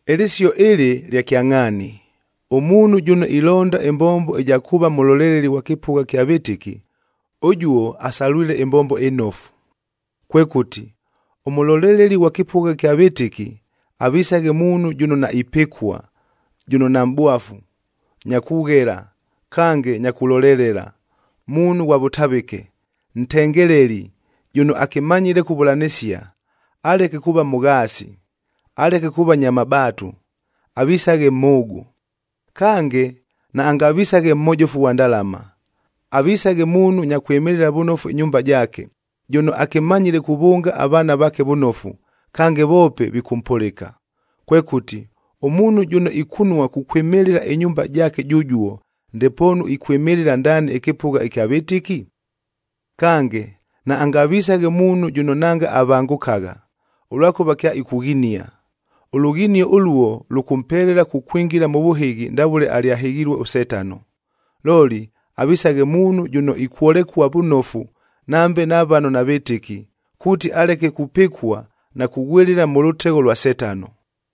Ɨlɨsio ɨlɨ lya kyangʼhaani, “Ʉmuunhu jʉno ilonda ɨmbombo ɨja kuuva mʉloleleli ghwa kɨpʉgha ɨkya vɨtɨki, ʉjuo asalwile ɨmbombo ɨnofu.” Kwekʉti, ʉmʉloleleli ghwa kɨpʉgha ɨkya vɨtɨki, avisaghe muunhu jʉno naipɨkua, jʉno namʼbwafu,a nya kughela kange nya kulolelela, muunhu ghwa vʉtavɨke, ntengeleli, jʉno akɨmanyile kuvʉlanɨsia. Aleke kuuva mʉghaasi, aleke kuuva nya mabaatu, avisaghe mhʉʉgʉ. Kange, naangavisaghe mhojofu ghwa ndalama. Avisaghe muunhu nya kwɨmɨlɨla vʉnofu ɨnyumba jaake, jʉno akɨmanyile kuvʉnga avaana vaake vʉnofu, kange voope vikʉmpʉlɨka. Kwekʉti, ʉmuunhu jʉno ikunua kukwɨmɨlɨla ɨnyumba jaake jʉjuo, ndepoonu ikwɨmɨlɨla ndaani ɨkɨpʉgha ɨkya vɨtɨki? Kange, naangavisaghe muunhu jʉno nanga avangʉkagha, ʉlwakʉva kyaikughinia. Ʉlughinio ʉluo lʉkʉmpelela kukwingila mʉ vʉhɨghi ndavʉle alyahɨghilue ʉSetano. Looli, avisaghe muunhu jʉno ikwolekua vʉnofu nambe na vano navɨtɨki, kuuti aleke kupɨkua na kughwɨlɨla mʉ lʉtegho lwa Setano.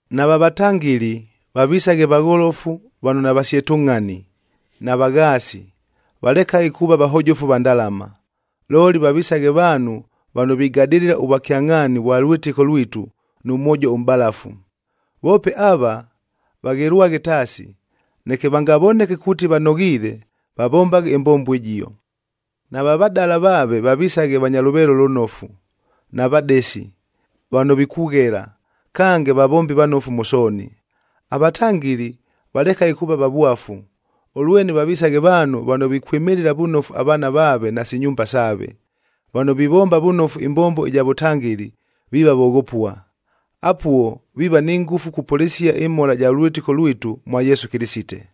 Nava vatangɨli vavisaghe vagholofu vano navasyetʉngʼhani, navaghaasi, valekaghe kuuva vahojofu va ndalama. Looli, vavisaghe vaanhu vano vigadɨlɨla ʉvwakyangʼhaani vwa lwɨtɨko lwitu nʉ mwojo ʉmʼbalafu. Voope ava, vaghelwaghe taasi, neke vangavoneke kuuti vanoghiile, vavombaghe ɨmbombo ɨjio. Nava vadala vaaveb vavisaghe vanya lʉveelo lʉnofu, navadesi, vano vikughela, kange vavombi vanofu mʉ sooni. Avatangɨli valekaghe kuuva vavwafu,c ʉlwene vavisaghe vaanhu vano vikwɨmɨlɨla vʉnofu avaana vaave nasi nyumba saave. Vano vivomba vʉnofu ɨmbombo ɨja vʉtangɨli, viiva voghopua. Apuo viiva ni ngʉfu kupʉlɨsia ɨmhola ɨja lwɨtɨko lwitu mwa Yesu Kɨlɨsite.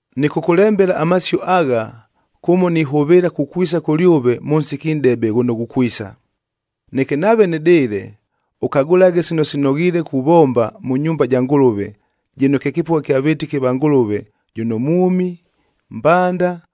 Nɨkʉkʉlembela amasio agha, kʉmo nihʉvɨɨla kukwisa kʉlyʉve mʉ nsiki nʼdebe ghʉno ghukwisa. Neke nave nɨdɨɨle, ʉkagʉlaghe sino sinoghiile kuvomba mʉ nyumba ja Ngʉlʉve, jɨno kye kɨpʉgha kya vɨtɨki va Ngʉlʉve jʉno mwʉmi, mbanda,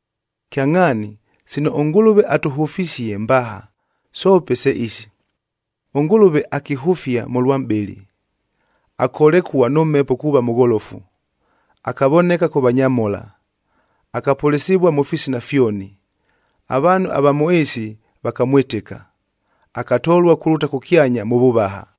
Kyangʼhaani, sino ʉNgʉlʉve atʉhʉfisie mbaha, soope se isi: ɄNgʉlʉve akihʉfia mʉlwa mʼbɨlɨ, akolekua nʉ Mhepo kuuva mʉgholofu, akavoneka kʉ vanyamhola, akapʉlɨsɨvua mʉ fisina fyoni, avaanhu ava mʉ ɨɨsi vakamwɨtɨka, akatolua kulʉta kʉkyanya mʉ vʉvaha.